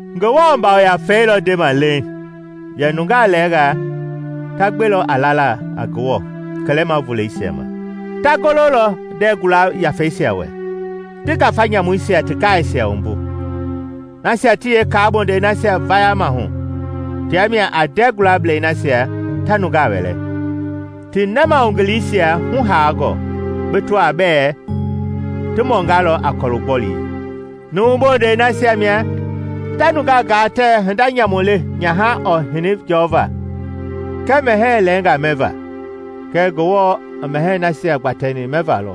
Ngewɔ Yafei lɔ ndema leiŋ yɛ nungaa lɛɛngaa ta gbelɔ a lala a Ngewɔ kɛlɛma voleisia ma; ta gololɔ ndɛɛ gula yafeisia wɛ, ti ngafa nyamuisia ti gaaisia wumbu. Nasia ti yeekaa bondɛi nasia vayama hu tia mia a ndɛɛ gulablɛi nasia ta nungaa wɛlɛ, ti nɛmahugiliyeisia hu haangɔ, bi tɔaa bɛ ti mɔngalɔ a kɔlu gbɔlii. Numu bondɛi nasia mia ta nungaa gaa tɛɛ hinda nyamu le nyaha ɔɔ hini jɔva kɛɛ mɛhɛɛ lɛɛngaa mɛva. Kɛɛ Ngewɔ i mɛhɛɛi nasia gbatɛni mɛva lɔ,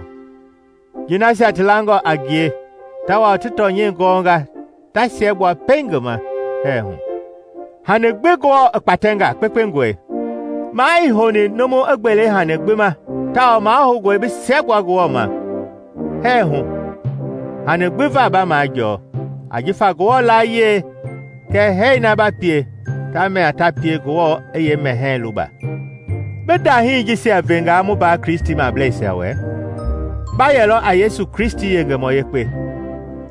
ji nasia ti langɔ a ngie tawao ti tɔnyɛi gɔnga ta siɛgbua pɛiŋ ngi ma hɛɛ hu. Hani gbi Ngewɔ i kpatɛnga kpekpengɔe; maa ii houni numu i gbele hani gbi ma tawao mahoungɔe bi siɛgbua Ngewɔ ma hɛɛ hu hani gbi va ba majɔɔ, ajifa Ngewɔ layie kɛɛ hɛɛ na ba pie tia mia ta pie Ngewɔ i yeemɛhɛi luba. Bi ndahii jisia vengaa mu mbaa Kristimableisia wɛ, ba yɛlɔ a Yesu Kristi yengemɔ yekpe,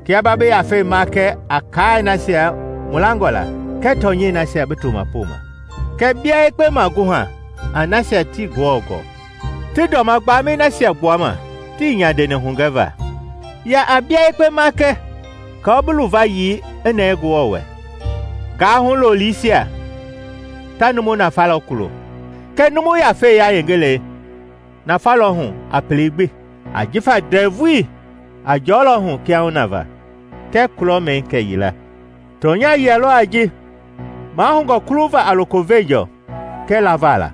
kia ba bi yafei makɛ a kaai nasia mu langɔ la kɛɛ tɔnyɛi nasia bi toma poma. Kɛɛ bia yekpe maguha a nasia tii Ngewɔ gɔɔ ti dɔma gbamɛi nasia tii nyandeni hugɛva. Ya a bia yekpe makɛ aako bi luvayii i nɛɛ Ngewɔ wɛ. Gaahu loliisia ta numu nafalɔ kulo, kɛɛ numu yafei yayengelɛi nafa lɔ hu a pelei gbi, ajifa ndɛvui a jɔlɔ hu kiahuna va kɛɛ kulɔmɛi kɛyila. Tɔnya yia lɔ a ji mahoungɔ kuluva a loko veenjɔɔ kɛɛ lava la.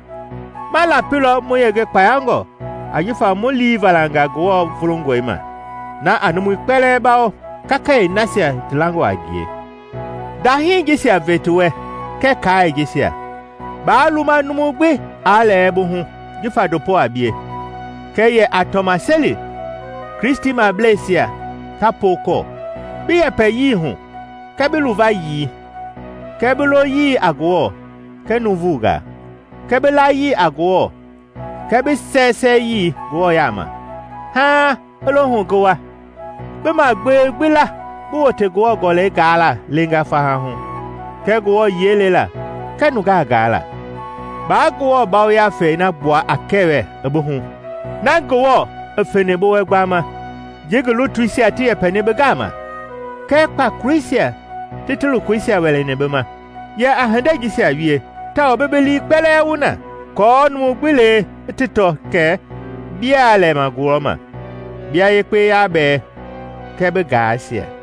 Ma lapilɔ mu yenge kpayangɔ ajifa mu lii valanga Ngewɔ vulungɔi ma, na a numui kpɛlɛɛ bawo kakayee nasia ti langɔ a ngie. Ndahii jisia ve ti wɛ kɛɛ kaai jisia. Baa luma numu gbi aa lɛɛ bi hu jifa ndopo a bie, kɛɛ yɛ a tɔmaseli Kristimableisia ta pookɔɔ, bi yɛpɛyii hu kɛɛ bi luvayii kɛɛ bi loyii a Ngewɔ kɛɛ nuuvungaa, kɛɛ bi layii a Ngewɔ kɛɛ bi sɛɛsɛɛyii Ngewɔ yaama. Haaŋ i lohu ngi wa, bi magbewei gbi la bi wote Ngewɔ Gɔlɛi gaala leenga faha hu, kɛɛ Ngewɔ yiɛi lela kɛɛ nungaa gaala. Baa Ngewɔ Yafei na gbua kɛwɛ i bi hu, na Ngewɔ i feni bi wɛ gbama ji ngi lutuisia ti yɛpɛni bi gama, kɛɛ kpakoleisia ti ti lokoisia wɛlɛni bi ma. Yɛ a hindei jisia wie, tawao bi bi lii kpɛlɛɛ wu na, aako numu gbi lee ti tɔ kɛ bia lɛma gulɔma. Bia yekpe yabɛɛ kɛɛ bi gaaisia.